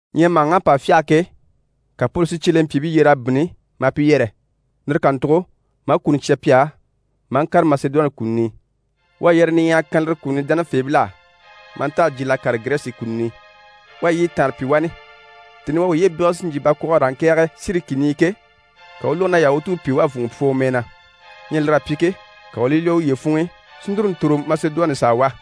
Ɲyɛ màhaŋ'à pa fyâha ke, ka Poli si cyelempyiibii yyer'a bínni maa pi yɛrɛ, lire kàntugo maa kuni cya pi á maa ŋkàre Masedoni kùluni i. U à yɛrɛyɛ niɲyahaya kan lire kùluni dánafeebil'á maa nta a jyiil'a kàre Girɛsi kùluni i. U à yiɲyɛ taanre pyi wani. Tèni i u à uye bégele si jyè bakwɔɔge e raa ŋkɛ̀ɛge Siri kìni i ke, ka u u lógo na Yahutuubii pìi na wá a vùnŋɔ pwɔ u mɛɛ na. Ɲyɛ lir'à pyi ke, ka u u li lwɔ́ uye funŋ'i si núru ntòro Masedoni i s'a wá.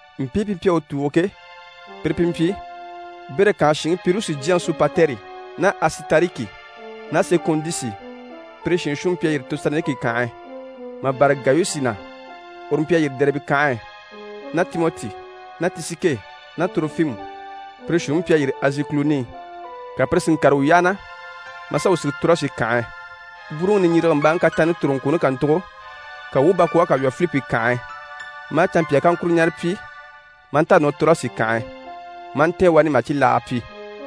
Mpii pi mpyi a u tùugo ke, pire pi mpyi Bere kànhe shinŋi Pirusi jyaŋi Sopatɛri ná Asitariki ná Sekundusi, pire shiin shuunniŋi mpyi a yîri Tesaloniki kànhe e, mà bâra Gayusi na, uru mpyi a yîri Dɛribe kànhe e, ná Timɔti, ná Tisike ná Torofimu, pire shiin shuunniŋi mpyi a yîri Azi kùluni i. Ka pire si ŋkàre wuu yyaha na maa sà wuu sige Torasi kànhe e. Bwúuruŋi niɲjirigembaaŋi kataanni toroŋkwooni kàntugo, ka wuu u bakwɔɔge kà lwɔ́ Filipi kànhe e, maa canmpyaa kaŋkuro ɲara pyi maa nta a nɔ Torasi kànhe e, maa ntɛ̀ɛn wani mà cibilaaga pyi.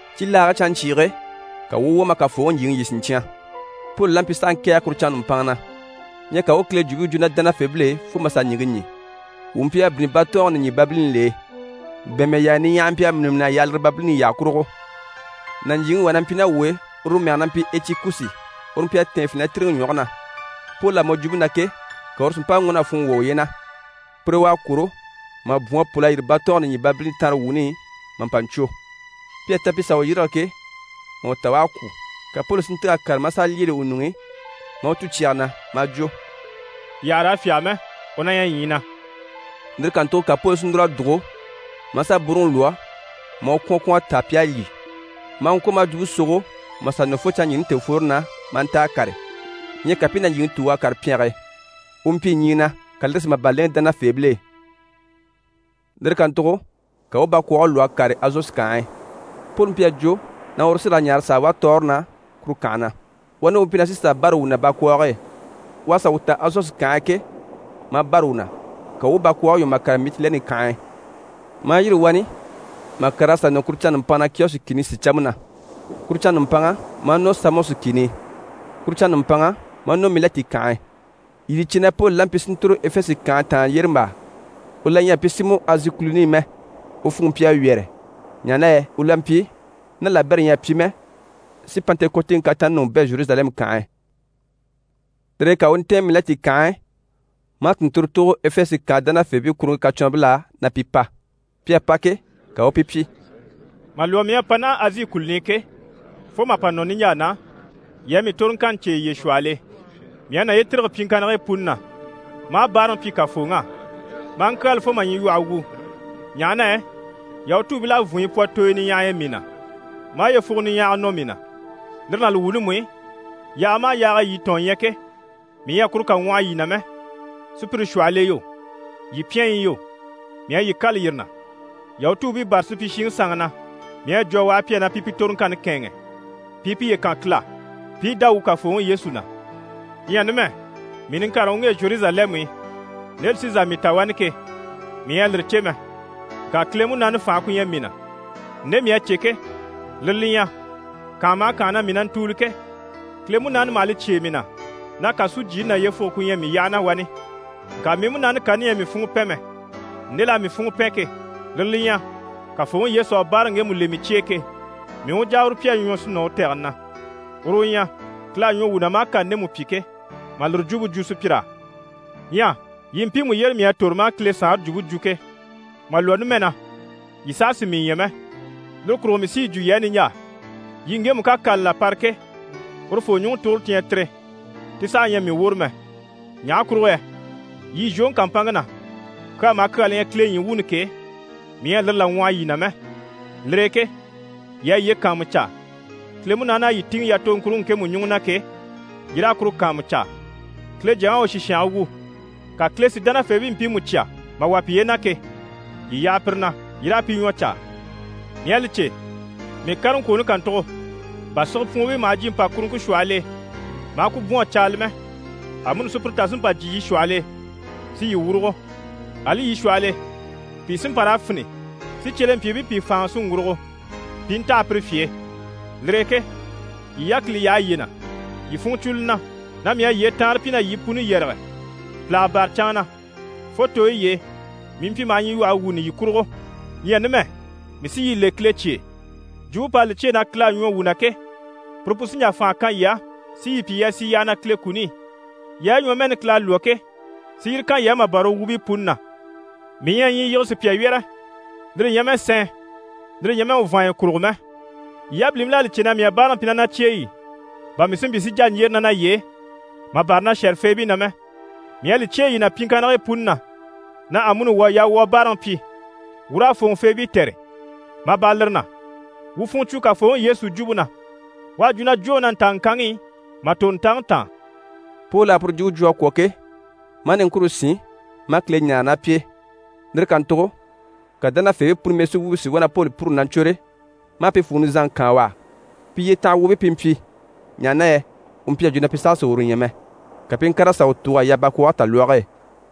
Cibilaage canɲcyiige ka wuu u wwɔ̀ maa Kafooŋi ɲjyìŋi lyî siɲcyan. Poli la mpyi s'a ŋkɛ̀ɛge kuru canŋa nùmpanŋa na. Ɲyɛ ka u u Kile Jwumpe jwo ná dánafeebil'e fo mà sà ɲìŋke ɲî. Wuu mpyi a bínni batɔɔnge nìɲyibabilini l'e, bɛ̀ɛnmɛ yaaya niɲyahaya mpyi a mîni mîn'a yaha lire babilini yyaha kurugo. Nàɲjiiŋi wà na mpyi ná wuu e, uru mɛge na mpyi Etikusi, uru mpyi a tɛ̀ɛn finɛtiriŋi ɲwɔge na. Poli à mɔ jwumpe na ke, ka uru si mpa ŋɔ́n'a funŋɔ wwɔ̀ uye na. Pur'e u à kwôro mà bwɔ̀n a pôl'a yîri batɔɔnge nìɲyibabilini tanrewuuni i mà pa ɲcwo. Pi à ta pi sà u yîrige ke, mà u ta u à kwû. Ka Poli si ntîg'a kàre maa sà lyêele u ɲuŋ'i, maa u cû u cyeyi na maa jwo: «Yii àha raa fyáge mɛ, u na ɲyɛ ɲyii na!» Lire kàntugo ka Poli si núr'a dùgo maa sà bwúuruŋi lwɔ́ maa u kwɔ̀n kwɔ̀n a táa pi à lyî, maa ŋkwɔ̀ maa jwumpe sogo mà sà nɔ fo canŋaɲyiini tèefworoni na, maa nta a kàre. Ɲyɛ ka pi i nàɲjiiŋi tùug'a kàre pyɛnge e, u mpyi ɲyii na, ka lire si màban lèŋɛ dánafeebil'e. Lire kàntugo ka wuu u bakwɔɔge lwɔ́ a kàre Azosi kànhe e. Poli mpyi a jwo na uru sí raa ɲaare s'a wá tɔɔre na kuru kànhe na. Wani u mpyi na sí sà bâra wuu na bakwɔɔge e. U à sà wuu ta Azosi kànhe e ke, maa bâra wuu na, ka wuu u bakwɔɔge lwɔ́ mà kàre Mitilɛni kànhe e, maa yîri wani mà kàr'a sà nɔ kuru canŋa nùmpanŋa na Kiyɔsi kìni sìcampe na. Kuru canŋa nùmpanŋa, maa nɔ Samɔsi kìni i. Kuru canŋa nùmpanŋa, maa nɔ Milɛti kànhe e. Yii li cè na Poli la mpyi si ntòro Efese kànhe taan yyérembaa. U la ɲyɛ a mpyi si mɔ Azi kùluni i mɛ. U funŋke mpyi a wyɛ̀rɛ, ɲaha na yɛ u la mpyi, ná labɛrɛ ɲyɛ a pyi mɛ, si Pantekɔtiŋi kataanni ɲùŋɔ bɛ̂ Zheruzalɛmu kànhe e. Lire e ka u u ntɛ̀ɛn Milɛti kànhe e maa tùnnturo tùugo Efese kànhe dánafeebii kuruŋke kacwɔnribil'á, na pi pa. Pi à pa ke, ka u u pi pyi: «Mà lwɔ́ mii à pa naha Azi kùluni i ke, fo mà pa nɔ niɲjaa na, yii à mii toroŋkanni cè yiye shwɔhɔl'e. Mii à naye tîrige pyiŋkannigii puni na, maa báaraŋi pyi Kafooŋi á, maa ŋkyaala fo mà ɲyilwɔhe wu, ɲaha na yɛ Yahutuubil'à vùnɲyi pwɔ tooyo niɲyahay'e mii na, maa yyefugo niɲyahaga nɔ mii na. Lire ná li wuuni mú i, yaaga maha yaag'e yii tɔ̀ɔn ɲyɛ ke, mii ɲyɛ a kuru kà ŋwɔhɔ yii na mɛ. Sùpyire shwɔhɔl'e yo, yii pyɛnyi i yo, mii à yii kâla yire na. Yahutuubii bâra supyishiŋi sanŋi na, mii à yi jwo a waha pi á na pi pi toroŋkanni kɛ̂ɛnŋɛ, pi i piye kan Kile á, pi i dá wuu Kafooŋi Yesu na. Ɲyɛ numɛ, mii niŋkareŋi u ŋge Zheruzalɛmu i, nde li sí n‑sà mii ta wani ke, mii ɲyɛ a lire cè mɛ. Ŋka Kile Munaani fànhe ku ɲyɛ mii na. Nde mii à cè ke, lire li ɲyɛ: kànha maha kànha na mii na ntùuli ke, Kile Munaani maha li cyêe mii na na kàsujyiini ná yyefuge ku ɲyɛ mii yyaha na wani. Ŋka mii múnaani kani ɲyɛ a mii funŋɔ pɛn mɛ. Nde l'à mii funŋɔ pɛn ke, lire li ɲyɛ: Kafooŋi Yesu à báaraŋi ŋgemu le mii cye e ke, mii u jà a uru pyi a ɲwɔ si nɔ u tɛgɛni na. Uru u ɲyɛ, Kile à ɲwɔ wuu na maa kani ndemu pyi ke, mà lire jwumpe jwo sùpyir'á. Ɲyɛ yii mpiimu yyére mii à tòro maa Kile Saanre jwumpe jwo ke, mà lwɔ́ numɛ na, yii saha sì mii ɲya mɛ. Lire kurugo mii sí yi jwo yii á niɲjaa, yii ŋgemu ká kani là para ke, urufoo ɲùŋɔ tuguro ti ɲyɛ tire, ti saha ɲyɛ mii woro mɛ. Ɲaha kurugo yɛ yii zhwoŋi kàmpanŋke na, kyaa maha kyaa li ɲyɛ Kile ɲyii wuuni ke, mii ɲyɛ a lire là ŋwɔhɔ yii na mɛ. Lire e ke yii a yiye kàanmucaa, Kile Munaani à yii tìŋɛ yatoŋkuruŋke ŋkemu ɲùŋɔ na ke, yii raa kuru kàanmucaa. Kile Jyaŋi à u sìshange wu, ka Kile si dánafeebii mpiimu cya mà wà piye na ke, yii yaha pire na, yii raa pi ɲwɔ caa. Mii à li cè, mii kareŋkwooni kàntugo, bà sigepwuunbii maha jyè mpàkuruŋke shwɔhɔl'e maa ku bwɔ̀n a caala mɛ, amuni sùpyire tà sí n‑pa jyè yii shwɔhɔl'e si yii wurugo. Ali yii shwɔhɔl'e, pìi sí n‑pa raa fini si cyelempyiibii pìi fáanŋa si ŋgurugo pi i ntaha pire fye e. Lire e ke yii yákili yaha yiye na, yii funɲyi cwo li na na mii à yyee taanre pyi na yii puni yɛrɛge pìlaga bâra canŋa na, fo tooyi y'e mii mpyi maha ɲyilwɔhe wuuni yii kurugo. Ɲyɛ numɛ, mii sí yii le Kile cye e. Jwumpe p'à li cyêe na Kile à ɲwɔ wuu na ke, puru pu sí n‑jà fànha kan yii á si yii pyi yii a sì yyaha na Kile kuni i, yaayi ɲwɔmɛɛni Kile à lwɔ́ ke, si yire kan yii á mà bâra u wuubii puni na. Mii ɲyɛ a ɲyii yige sùpya wyɛ́rɛ, lire ɲyɛ mɛ sɛɛn, lire ɲyɛ mɛ u vàanya kurugo mɛ. Yii yabilimpil'à li cè na mii à báaraŋi pyi ná na cyeyi i, bà mii si mpyi si jà ɲjyére ná naye e, mà bâra na shɛ̀rɛfeebii na mɛ. Mii à li cyêe yii na pyiŋkannigii puni na, na amuni wuu à yaa wuu a báaraŋi pyi, wuu raa fòŋɔfeebii tɛ̀re, mà bâra lire na, wuu u funŋɔ cwo Kafooŋi Yesu jwumpe na. U à jwo na “Jwóŋi na ntaa ŋkanŋi i mà tòro ntaŋi taan.”» Poli à puru jwumpe jwo a kwɔ̀ ke, maa niŋkure sín maa Kile ɲáare ná pi e. Lire kàntugo ka dánafeebii puni mɛsuwuubii si wá na Poli pûruli na ɲcwôre maa pi fwùŋi nizanŋi kaan u á. Pi yyetanha wuubii pi mpyi, ɲaha na yɛ u mpyi a jwo na pi saha sì uru ɲya mɛ, ka pi i ŋkàr'a sà u tùug'a yaha bakwɔɔge talwɔge e.